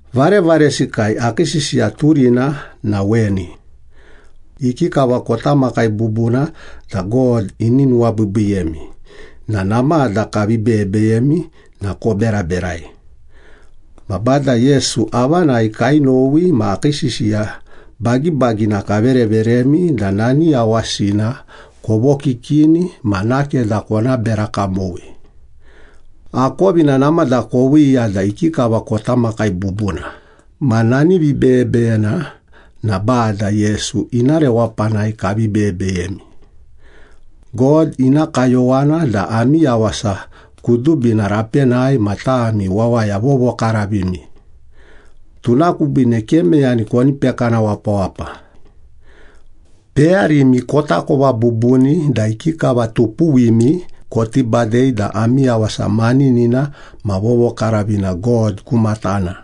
Varevaresikai, akii sisiya turina na weni. Ikikava kota makai bubuna da God ini nuwabiibiiyemi na namada kavi beyebeyemi na koberaberai. Ma Bada Yesu avanai kainowi ma akii sisiya bagibagina kavereveremi da nani yawasina kovokikini ma nakeda kona bera kamowi. Akovina namada koviiya da ikikava kota makai bubuna, ma nani vibeyebeyena na Bada Yesu ina rewapanai kavi beyebeyemi. God ina kayowana da ami yawasa kudubina rapenai ma tami wawaya vovokaravimi. Tuna kubiine ke meyani koni pekana wapawapa. Peyarimi kotakova bubuni da ikikava tupuwimi koti badei da ami yawasa maninina ma vovokaravina God ku matana.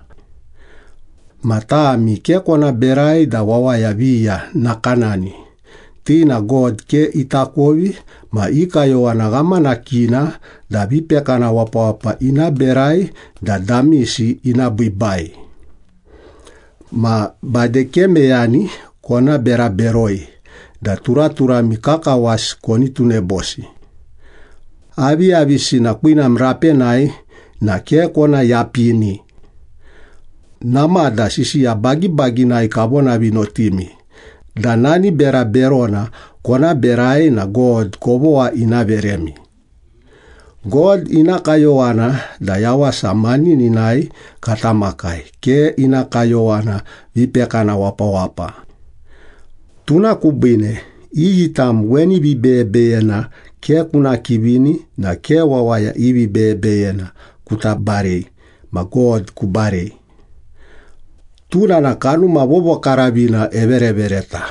Ma tami ke kona berai da wawaya viya nakanani, ti na God ke itakovi ma i kayowana ghamanakina da vipekana wapawapa ina berai da damisi ina biibai. Ma bade ke meyani kona bera beroi da turaturami kakawasi koni tunebosi. Aviyavisina kwinam rapenai na ke kona yapini. Namada sisiya bagibaginai kavonavinotimi da nani bera berona kona berai na God kovogha ina veremi. God ina kayowana da yawasa manininai kata makai, ke ina kayowana vipekana wapawapa. Tuna kubiine, iyi tam weni vibeyebeyena ke kuna kivini na ke wawaya i vibeyebeyena kuta barei ma God kubarei. Tuna na Kanuma Vovokaravina everevereta.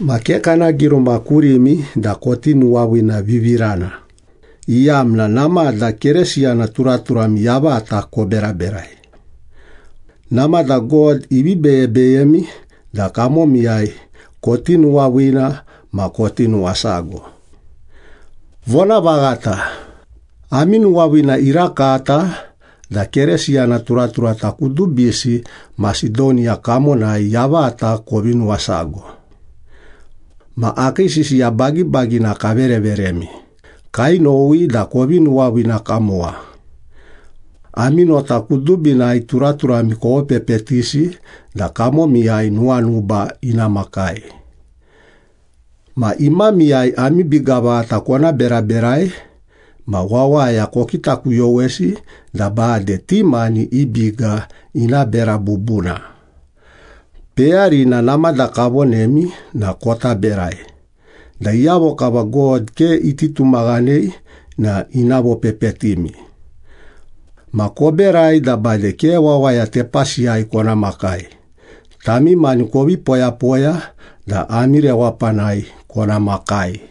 Ma ke kana giruma kurimi da koti nuwaviinavivirana, iyamna namada Keresiyana turaturami yavata koberaberai. Namada God ivi beyebeyemi da kamomiyai koti nuwaviina ma koti nuwasago. Vonavaghata, ami nuwaviina irakata da Keresiyana turaturata kudubisi Masedoniya kamonai yavata kovi nuwasago. Ma akii sisiya bagibagina kavereveremi, kainowi da kovi nuwaviina kamowa. Ami nota kudubinai turaturami kovopepetisi da kamomiyai nuwanuba ina makai. Ma imamiyai ami biga vaghata kona beraberai, ma wawaya kokitakuyowesi da bade ti mani i biga ina bera bubuna. Peyarina namada kavonemi na kota berai, da iyavo kava God ke iti tumaghanei na ina vopepetimi. Ma koberai da bade ke wawaya tepasiyai kona makai, tami mani kovi poyapoya da ami rewapanai kona makai.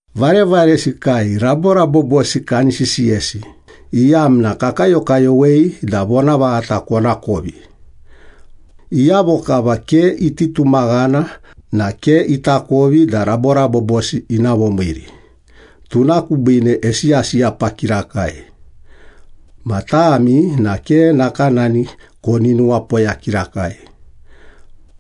Varevaresikai, raborabobosi kani sisiyesi, iyamna kakayokayowei da vonavaghata konakovi. Iyavo kava ke iti tumaghana na ke itakovi da raborabobosi ina vomiiri, tuna kubiine esiyasiyapa kirakai. Ma tami na ke nakanani koni nuwapoya kirakai.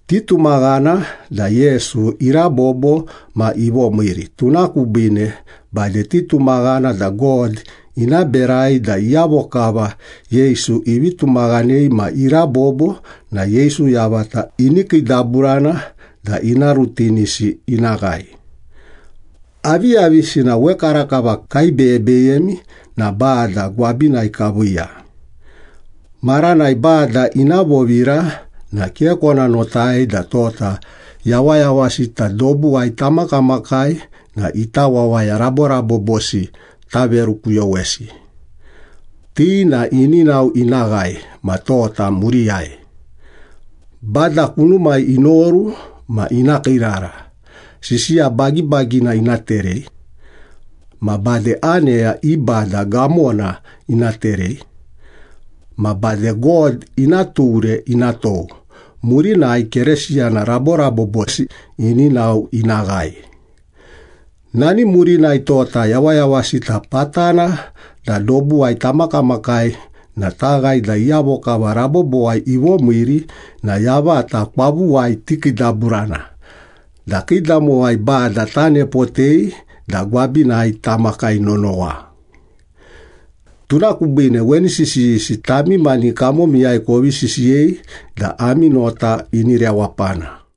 Titumaghana da Yesu irabobo ma ivomiiri, tuna kubiine bade titumaghana da God ina berai da iyavo kava Yesu ivi tumaghanei ma irabobo na Yesu yavata ini kiidaburana da ina rutinisi ina ghae. Aviyavisina wekarakava kaibeyebeyemi na Bada gwabinai kaviiya. Maranai Bada ina vovira na ke kona notai da tota yawayawasita dobuwai tamakamakai na ita wawaya raborabobosi taverukuyowesi. Ti na ini nao ina ghae ma tota muriyai. Bada kunumai inoru ma ina kiirara, sisiya bagibagina ina terei. Ma bade aneya i bada gamona ina terei. Ma bade God ina ture ina tou. Murinai Keresiyana raborabobosi ini nao ina ghae. Nani murinai, tota yawayawasita patana da dobuwai tamakamakai na taghae da iyavo kava rabobowai ivomiiri na yavata kwavuwai tikiidaburana da kiidamowai Bada tanepotei da gwabinai tamakai nonowa. Tuna kubiine weni sisiyisi tami mani kamomiyai kovi sisiyei da ami nota ini rewapana.